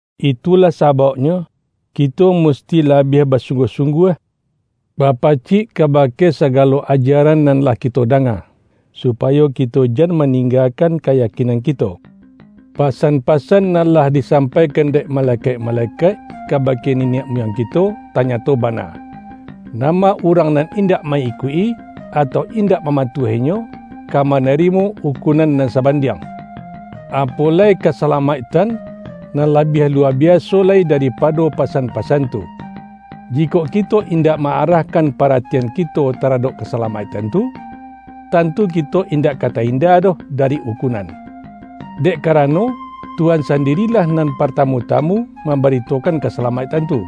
Itulah sabauknyo, kito musti la-biah basungguah-sungguah ba-pacik kabake sagalo ajaran nan lah kito danga, supayo kito jan maning-gakan kayakinan kito. Pasan-pasan nan lah disampaikan dek malekaik-malekaik kabake niniak muyang ki-to, tanyato bana, nama urang nan indak ma-ikuik-i, atau indak mama-tuah-inyo, ka manarimo ukunan nan sabandiang. Apo lai kasalamaik-tan, nan labiah luwa biaso lai dari-pado pasan-pasan tu! Jikok kito in-dak ma-arahkan paratian kito taradok kasalamaiktan tu, tantu kito indak ka ta-inda doh dari ukunan. Dek kara-no, Tuhan sandirilah nan partamu-ta-mu mambaritokan kasalamaiktan tu.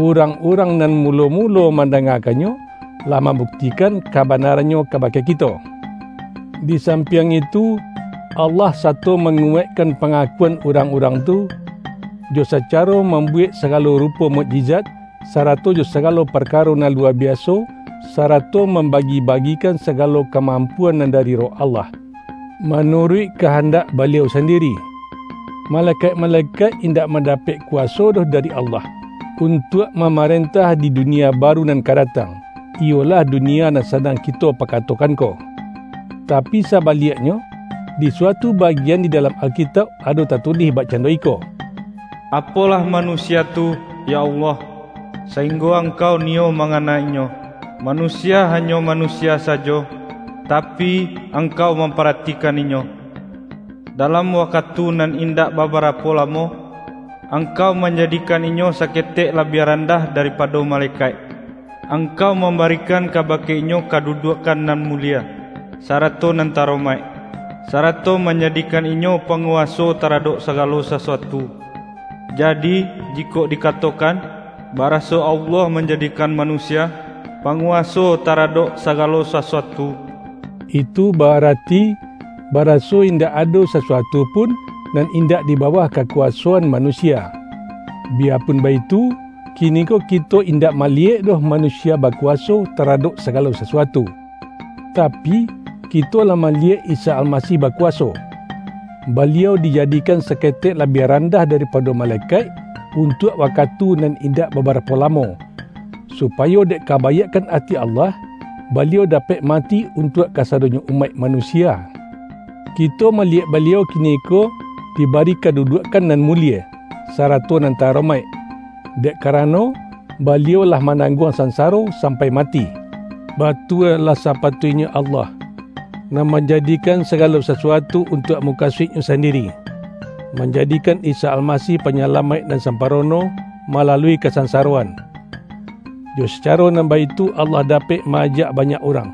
Urang-urang nan mulo-mulo manda-ngakannyo, lah mambuktikan kaba-narannyo kabake kito. Di sampiang itu, Allah sato manguwaikkan panga-kuan urang-urang tu, jo sacaro mam-buwek sagalo rupo mukjizat, sarato jo sagalo parkaro nan luwa biaso, sarato mambagi-bagikan sagalo kamampuan nan dari Roh Allah, manuruik kahan-dak Baliau sandiri. Malekaik-malekaik indak manda-pek kuwaso doh dari Allah, untuak mamarentah di dunia baru nan ka datang, iyolah dunia nan sadang ki-to pakatokan ko. Tapi sabaliaknyo, di suatu bagian di dalam Alkitauk ado tatulih bakcando iko,”Apolah manusia tu, yo Allah, sainggo Angkau niyo mangana inyo? Manusia hanyo manusia sajo, tapi, Angkau mamparatikan inyo! Dalam wakatu nan indak babarapo lamo, Angkau manjadikan inyo saketek labiah randah daripado malekaik. Angkau mambarikan kabake inyo kaduduakkan nan mulie, sarato nan ta-aromaik, sarato manjadikan inyo panguwaso taradok sagalo sasuatu.” Jadi, jikok dikatokan, baraso Allah manjadikan manusia”panguwaso ta-radok sagalo sasuatu”, itu ba-arati, baraso indak ado sasuatu pun, nan indak di bawah kakuwasoan manu-sia. Biyapun baitu, kiniko kito indak maliyek doh manusia bakuwaso ta-radok sagalo sasuatu. Tapi, kito lah maliyek Isa Almasih bakuwaso! Ba-liau dijadikan saketek labiah randah daripado malekaik, untuak wakatu nan indak babarapo lamo, supayo dek kabaiakkan ati Allah, Baliau dapek mati untuak kasadonyo umaik manu-sia. Kito maliyek Baliau kiniko dibari kaduduakkan nan mulie, sarato nan ta-aromaik, dek karano, Baliau lah manangguang sansaro sampai mati. Batua lah sapatuiknyo Allah — nan manjadikan sagalo sasuatu untuak mukasuik-Nyo sandiri — manjadikan Isa Almasih Panyalamaik nan sampa-rono malalui kasansaroan. Jo sacaro nan baitu Allah dapek ma-ajak ba-nyak urang,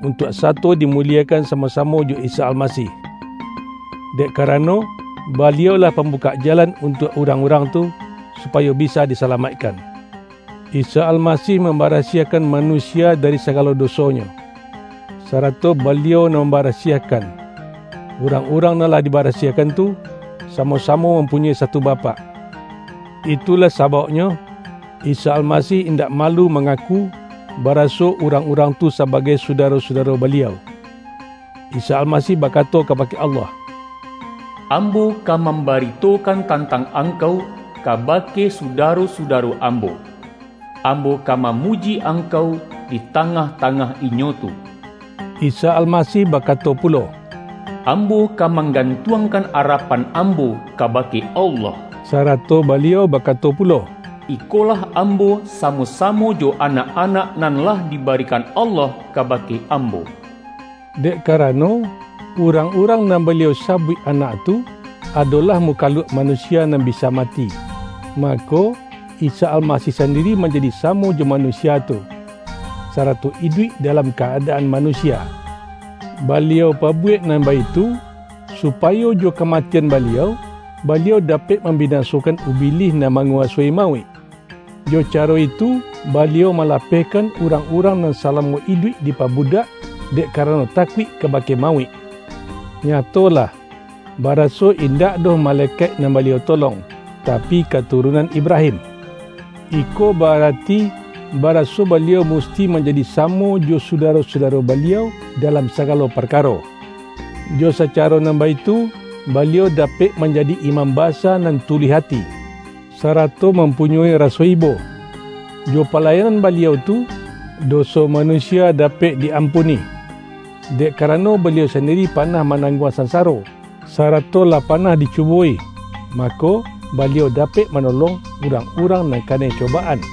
untuak sato dimuliekan samo-samo jo Isa Almasih. Dek ka-rano, Baliau-lah pambukak jalan untuak urang-urang tu, supayo bisa disalamaikkan. Isa Almasih mambarasiahkan manusia dari sagalo dosonyo; sarato Baliau nan mambarasiahkan. Urang-urang nan lah dibarasiahkan tu, sa-mo-samo mampunyoi satu Bapak. Itulah sabauknyo, Isa Almasih indak malu mangaku baraso urang-urang tu sabagai sudaro-sudaro Baliau. Isa Almasih bakato kabake Allah,”Ambo ka mambaritokan tantang Angkau, kabake sudaro-sudaro Ambo. Ambo ka mamuji Angkau, di tangah-tangah inyo tu.” Isa Almasih bakato pulo,”Ambo ka manggantuangkan arapan Ambo kabake Allah.” Sarato Baliau bakato pulo,”Ikolah Ambo, samo-samo jo anak-anak nan lah dibarikan Allah kabake Ambo.” Dek karano, urang-urang nan Baliau sabuik anak tu, adolah muka-luak manusia nan bisa mati, mako, Isa Almasih sandiri manjadi samo jo manusia tu, sarato iduik dalam ka-adaan manusia. Baliau pabuwek nan baitu, supayo jo kamatian Ba-liau, Baliau dapek mambinasokan Ubilih nan manguwasoi mauik. Jo caro itu, Baliau malapehkan urang-urang nan salamo iduik dipabudak, dek karano takuik kabake mauik. Nyatolah, baraso indak doh malekaik nan Baliau tolong, tapi katu-runan Ibrahim. Iko ba-arati, ba-raso Baliau musti manjadi samo jo sudaro-sudaro Baliau dalam saga-lo parkaro. Jo sacaro nan baitu, Baliau dapek manjadi Imam Ba-sa nan tuluih ati, sarato mampu-nyoi raso ibo. Jo palayanan Baliau tu, doso manusia dapek di-ampuni. Dek karano Baliau sandiri pa-nah manangguang sansaro, sarato lah panah dicubo-i, mako, Baliau dapek manolong urang-urang nan kanai cobaan.